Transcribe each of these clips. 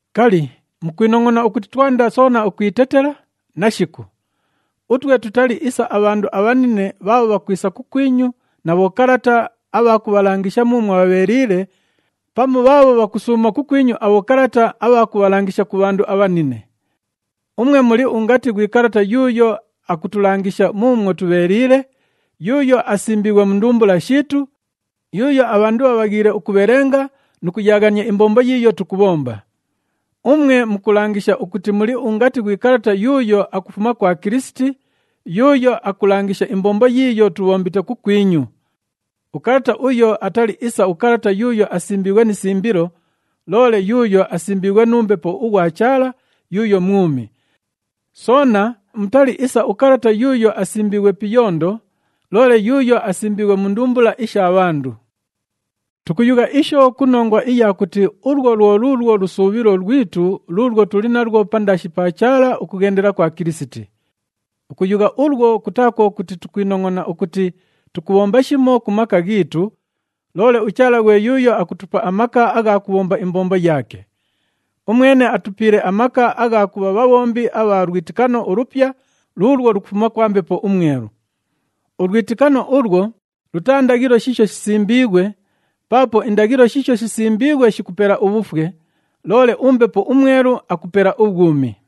Kali, mukwinongʼona ukuti twanda soona ukwitetela? Nashiku! Utwe tutali isa abhandu abhanine bhaabho bhakwisa kukwinyu na bhokalata abha kubhalangisha muumwo bhabheeliile, pamu bhaabho bhakusuuma kukwinyu abhokalata abha kubhalangisha ku bhandu abhanine. Umwe muli ungati ghwi kalata yuuyo akutulangisha muumwo tubheeliile, yuuyo asimbiighwe mu ndumbula shiitu, yuuyo abhandu bhabhaghiile ukubhelenga nu kuyaaghania imbombo yiiyo tukubhomba. Umwe mukulangisha ukuti muli ungati ghwi kalata yuuyo akufuma kwa Kilisiti, yuuyo akulangisha imbombo yiiyo tubhombite kukwinyu. Ukalata uyo atali isa ukalata yuuyo asimbiighwe ni simbilo, loole yuuyo asimbiighwe nu Mbepo ughwa Chaala yuuyo mwumi. Soona mutali isa ukalata yuuyo asimbiighwe pi iyondo, loole yuuyo asimbiighwe mu ndumbula isha bhandu. Tukuyugha isho ku nongwa iya kuti ulwo lwo luulwo lusuubhilo lwitu luulwo tuli nalwo pandaashi pa Chaala ukughendela kwa Kilisiti. Ukuyugha ulwo, kutaa kwo kuti tukwinongʼona ukuti tukubhomba shimo ku maka ghiitu, loole uChaala ghwe yuuyo akutupa amaka agha kubhomba imbombo yaake. Umwene atupiile amaka agha kubha bhabhombi abha lwitikano ulupya luulwo lukufuma kwa Mbepo uMwelu. Ulwitikano ulwo lutaa ndaghilo shiisho shisimbiighwe, paapo indaghilo shiisho shisimbiighwe shikupela ubhufwe, loole uMbepo uMwelu akupela ubhwumi.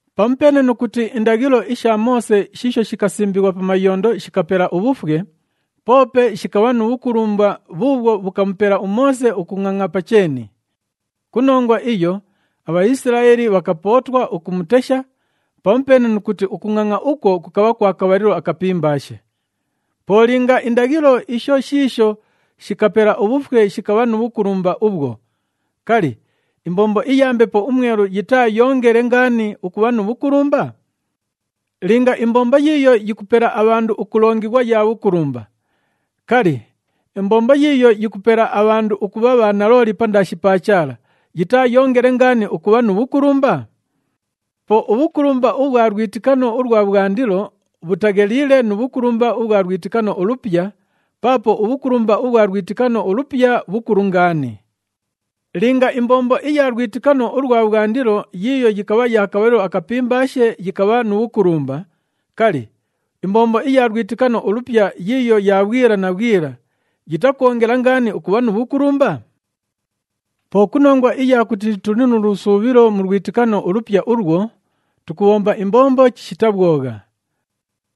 Pamupeene nu kuti indaghilo isha Moose shiisho shikasimbighwa pa mayondo shikapela ubhufwe, poope shikabha nu bhukulumba bhuubhwo bhukamupela uMoose ukungʼangʼa pa cheeni. Ku nongwa iyo aBhaisilaeli bhakapootwa ukumutesha, pamupeene nu kuti ukungʼangʼa ukwo kukabha kwa kabhalilo akapimbaashe. Po linga indaghilo isho shiisho shikapela ubhufwe shikabha nu bhukulumba ubhwo, kali, imbombo iya Mbepo uMwelu yitaayoongele ngaani ukubha nu bhukulumba? Linga imbombo yiiyo yikupela abhandu ukulongighwa ya bhukulumba, kali, imbombo yiiyo yikupela abhandu ukubha bhanalooli pandaashi pa Chaala, yitaayoongele ngaani ukubha nu bhukulumba? Po ubhukulumba ubhwa lwitikano ulwa bhwandilo bhutagheliile nu bhukulumba ubhwa lwitikano ulupya, paapo ubhukulumba ubhwa lwitikano ulupya bhukulu ngaani. Linga imbombo iya lwitikano ulwa bhwandilo yiiyo yikabha ya kabhalilo akapimbaashe yikabha nu bhukulumba, kali, imbombo iya lwitikano ulupya yiiyo ya bhwila na bhwila yitakwongela ngaani ukubha nu bhukulumba? Po ku nongwa iya kuti tuli nu lusuubhilo mu lwitikano ulupya ulwo, tukubhomba imbombo chishita bhwogha.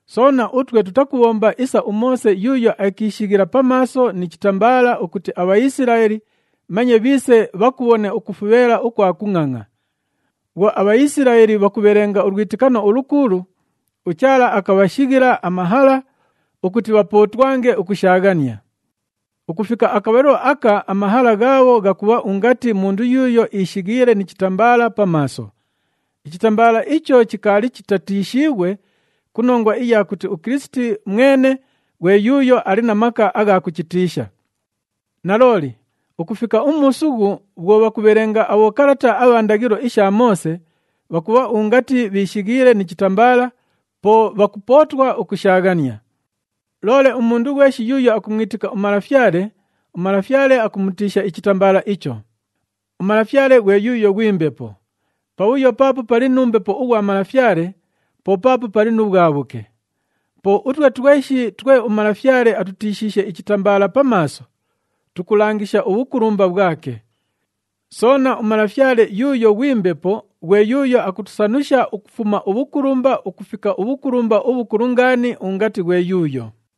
Soona, utwe tutakubhomba isa uMoose yuuyo akiishighila pa maaso ni chitambaala ukuti aBhaisilaeli manye bhiise bhakubhone ukufubheela ukwa kungʼangʼa. Bhwo aBhaisilaeli bhakubhelenga ulwitikano ulukuulu, uChaala akabhashighila amahala ukuti bhapootwange ukushaaghania. Ukufika akabhalilo aka amahala ghaabho ghakubha ungati mundu yuuyo ishighiile ni chitambaala pa maaso. Ichitambaala icho chikaali chitatiishiighwe ku nongwa iya kuti uKilisiti mwene ghwe yuuyo ali na maka agha kuchitiisha. Nalooli, ukufika umuusughu bhwo bhakubhelenga abhokalata abha ndaghilo isha Moose, bhakubha ungati bhishighiile ni chitambaala, po bhakupootwa ukushaaghania. Loole umundu ghweshi yuuyo akumwitika uMalafyale, uMalafyale akumutiisha ichitambaala icho. UMalafyale ghwe yuuyo ghwi Mbepo. Pabhuyo paapo pali nu Mbepo ughwa Malafyale, po paapo pali nu bhwabhuke. Po utwe tweshi twe uMalafyale atutiishiishe ichitambaala pa maaso, tukulangisha ubhukulumba bhwake. Soona, uMalafyale yuuyo ghwi Mbepo ghwe yuuyo akutusanusha ukufuma ubhukulumba ukufika ubhukulumba ubhukulu ngaani ungati ghwe yuuyo.